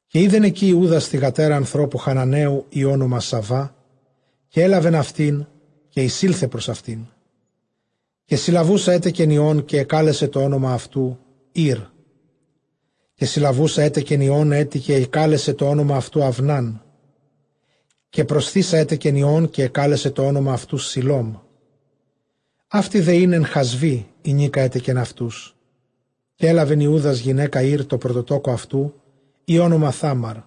Καὶ εἶδεν ἐκεῖ Ἰούδας θυγατέρα ἀνθρώπου Χαναναίου, ᾗ ὄνομα Σαυά· καὶ ἔλαβεν αὐτὴν, καὶ εἰσῆλθε πρὸς αὐτήν. Καὶ συλλαβοῦσα ἔτεκεν υἱὸν, καὶ ἐκάλεσε τὸ ὄνομα αὐτοῦ, Ἤρ. Καὶ συλλαβοῦσα ἔτεκεν υἱὸν ἔτι, καὶ ἐκάλεσε τὸ ὄνομα αὐτοῦ, Αὐνάν. Καὶ προσθεῖσα ἔτεκεν υἱὸν, καὶ ἐκάλεσε τὸ ὄνομα αὐτοῦ, Σηλώμ· αὕτη δὲ ἦν ἐν Χασβὶ, ἡνίκα ἔτεκεν αὐτούς. Καὶ ἔλαβεν Ἰούδας γυναῖκα Ἢρ τῷ πρωτοτόκῳ αὐτοῦ, ᾗ ὄνομα Θάμαρ.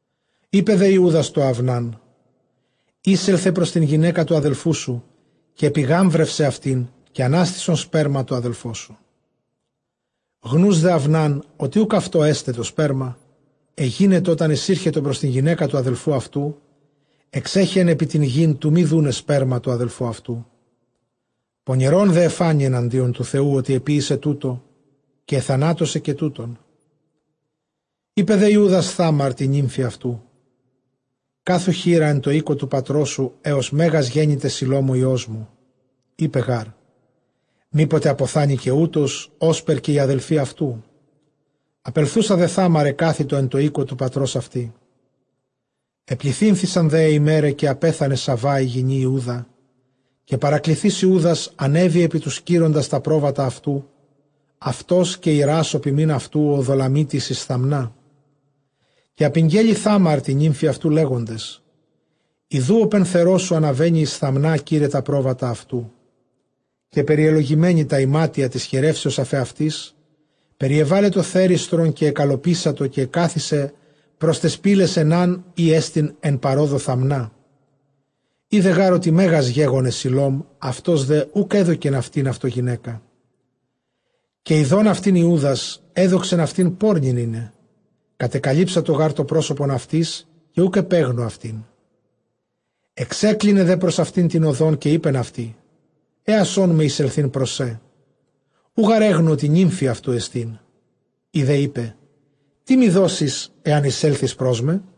Εἶπε δὲ Ἰούδας τῷ Αὐνάν· εἴσελθε πρὸς τὴν γυναῖκα τοῦ ἀδελφοῦ σου, καὶ ἐπιγάμβρευσαι αὐτὴν, καὶ ἀνάστησον σπέρμα τῷ ἀδελφῷ σου. Γνοὺς δὲ Αὐνὰν, ὅτι οὐκ αὐτῷ ἔσται τὸ σπέρμα, ἐγένετο ὅταν εἰσήρχετο πρὸς τὴν γυναῖκα τοῦ ἀδελφοῦ αὐτου, ἐξέχεεν ἐπὶ τὴν γῆν, τοῦ μὴ δοῦναι σπέρμα τῷ ἀδελφῷ αὐτοῦ. Πονηρὸν δὲ ἐφάνη ἐναντίον τοῦ Θεοῦ, ὅτι ἐποίησε τοῦτο· καὶ ἐθανάτωσε καὶ τοῦτον. Εἶπε δὲ Ἰούδας Θάμαρ τῇ νύμφῃ αὐτοῦ, κάθου χήρα ἐν τῷ οἴκῳ τοῦ πατρός σου, ἕως μέγας γένηται Σηλὼμ ὁ υἱός μου· εἶπε γάρ, μή ποτε ἀποθάνῃ καὶ οὗτος, ὥσπερ καὶ οἱ ἀδελφοὶ αὐτοῦ. Ἀπελθοῦσα δὲ Θάμαρ ἐκάθητο ἐν τῷ οἴκῳ τοῦ πατρὸς αὐτῆς. Ἐπληθύνθησαν δὲ αἱ ἡμέραι, καὶ ἀπέθανε Σαυὰ ἡ γυνὴ Ἰούδα· καὶ παρακληθεὶς Ἰούδας ἀνέβη ἐπὶ τοὺς κείροντας τὰ πρόβατα αὐτοῦ, αὐτὸς καὶ Εἰρὰς ὁ ποιμὴν αὐτοῦ ὁ Ὀδολλαμίτης εἰς Θαμνά. Καὶ ἀπηγγέλε Θάμαρ τῇ νύμφῃ αὐτοῦ, λέγοντες, ἰδοὺ ὁ πενθερός σου ἀναβαίνει εἰς Θαμνὰ, κεῖραι τὰ πρόβατα αὐτοῦ. Καὶ περιελομένη τὰ ἱμάτια τῆς χηρεύσεως ἀφʼ ἑαυτῆς, περιέβαλε τὸ θέριστρον, καὶ ἐκαλλωπίσατο, καὶ ἐκάθισε πρὸς ταῖς πύλαις Αἰνὰν, ἥ ἐστιν ἐν παρόδῳ Θαμνά· ἴδε γὰρ ὅτι μέγας γέγονε Σηλὼμ, αὐτὸς δὲ οὐκ ἔδωκεν αὐτὴν αὐτῷ γυναῖκα. Καὶ ἰδὼν αὐτὴν Ἰούδας ἔδοξεν αὐτὴν πόρνην εἶναι· κατεκαλύψατο γὰρ τὸ πρόσωπον αὐτῆς καὶ οὐκ ἐπέγνω αὐτήν. Ἐξέκλινε δὲ πρὸς αὐτὴν τὴν ὁδόν· καὶ εἶπεν αὐτῇ, ἔασόν με εἰσελθεῖν πρός σε· οὐ γὰρ ἔγνω, ὅτι νύμφη αὐτοῦ ἐστίν· ἡ δὲ εἶπε, τί μοι δώσεις, ἐὰν εἰσέλθῃς πρός με;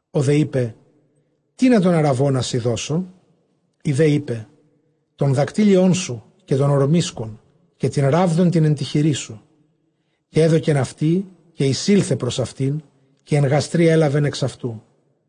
Ὁ δὲ εἶπε, τίνα τὸν ἀῤῥαβῶνά σοι δώσω; ἡ δὲ εἶπε, τὸν δακτύλιόν σου, καὶ τὸν ὁρμίσκον, καὶ τὴν ῥάβδον τὴν ἐν τῇ χειρίσου. Καὶ ἔδωκεν αὐτῇ, καὶ εἰσῆλθε πρὸς αὐτήν· καὶ ἐν γαστρὶ ἔλαβεν ἐξ αὐτοῦ.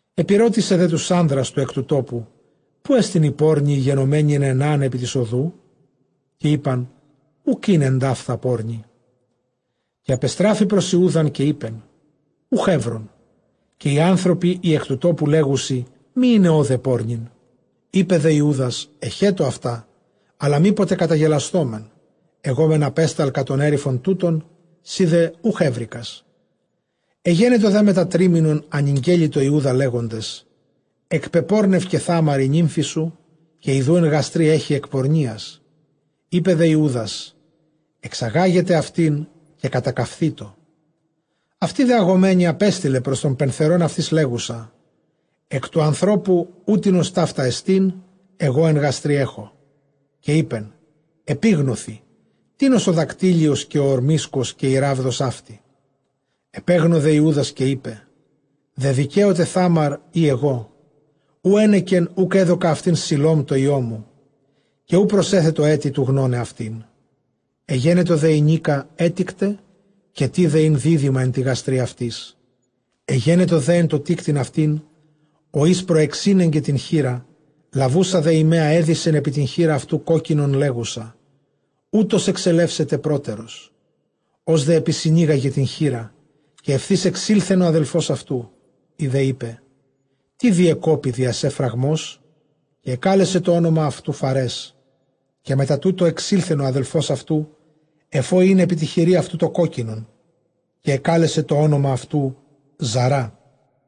Ἐπηρώτησε δὲ τοὺς ἄνδρας τοὺς ἐκ τοῦ τόπου, ποῦ ἐστιν ἡ πόρνη ἡ γενομένη ἐν Αἰνὰν ἐπὶ τῆς ὁδοῦ; καὶ εἶπαν, οὐκ ἦν ἐνταῦθα πόρνη. Καὶ ἀπεστράφη πρὸς Ἰούδαν, καὶ εἶπεν, οὐχ εὗρον· καὶ οἱ ἄνθρωποι οἱ ἐκ τοῦ τόπου λέγουσι, μὴ εἶναι ὧδε πόρνην. Εἶπε δὲ Ἰούδας, ἐχέτω αὐτά· ἀλλὰ μή ποτε καταγελασθῶμεν· ἐγὼ μὲν ἀπέσταλκα τὸν ἔριφον τοῦτον, σὺ δὲ οὐχ εὕρηκας. Ἐγένετο δὲ μετὰ τρίμηνον ἀνηγγέλη τῷ Ἰούδα, λέγοντες, ἐκπεπόρνευκε Θάμαρ ἡ νύμφη σου, καὶ ἰδοὺ ἐν γαστρὶ ἔχει ἐκ πορνείας· Εἶπε δὲ Ἰούδας, ἐξαγάγετε αὐτὴν, καὶ κατακαυθήτω. Αὐτὴ δὲ ἀγομένη ἀπέστειλε πρὸς τὸν πενθερὸν αὐτὴς, λέγουσα, ἐκ τοῦ ἀνθρώπου οὕτινος ταῦτά ἐστιν, ἐγὼ ἐν γαστρὶ ἔχω· καὶ εἶπεν, ἐπίγνωθι τίνος ὁ δακτύλιος, καὶ ὁ ὁρμίσκος καὶ ἡ ῥάβδος αὕτη. Ἐπέγνω δὲ Ἰούδας, καὶ εἶπε, δεδικαίωται Θάμαρ ἢ ἐγώ· οὗ ἕνεκεν οὐκ ἔδωκα αὐτὴν Σηλὼμ τῷ υἱῷ μου· Καὶ οὐ προσέθετο ἔτι τοῦ γνῶναι αὐτήν. Ἐγένετο δὲ ἡνίκα ἔτικτε, καὶ τῇδε ἦν δίδυμα ἐν τῇ γαστρὶ αὐτῆς. Ἐγένετο δὲ ἐν τῷ τίκτειν αὐτὴν, ὁ εἷς προεξήνεγκεν τὴν χεῖρα· λαβοῦσα δὲ ἡ μαῖα, ἔδησεν ἐπὶ τὴν χεῖρα αὐτοῦ κόκκινον, λέγουσα, οὗτος ἐξελεύσεται πρότερος. Ὡς δὲ ἐπισυνήγαγε τὴν χεῖρα, καὶ εὐθὺς ἐξῆλθεν ὁ ἀδελφὸς αὐτοῦ· ἡ δὲ εἶπε, τί διεκόπη διὰ σὲ φραγμός; καὶ ἐκάλεσε τὸ ὄνομα αὐτοῦ, Φαρές. Καὶ μετὰ τοῦτο ἐξῆλθεν ὁ ἀδελφὸς αὐτοῦ, ἐφʼ ᾧ ἦν ἐπὶ τῇ χειρὶ αὐτοῦ τὸ κόκκινον· καὶ ἐκάλεσε τὸ ὄνομα αὐτοῦ, Ζαρά.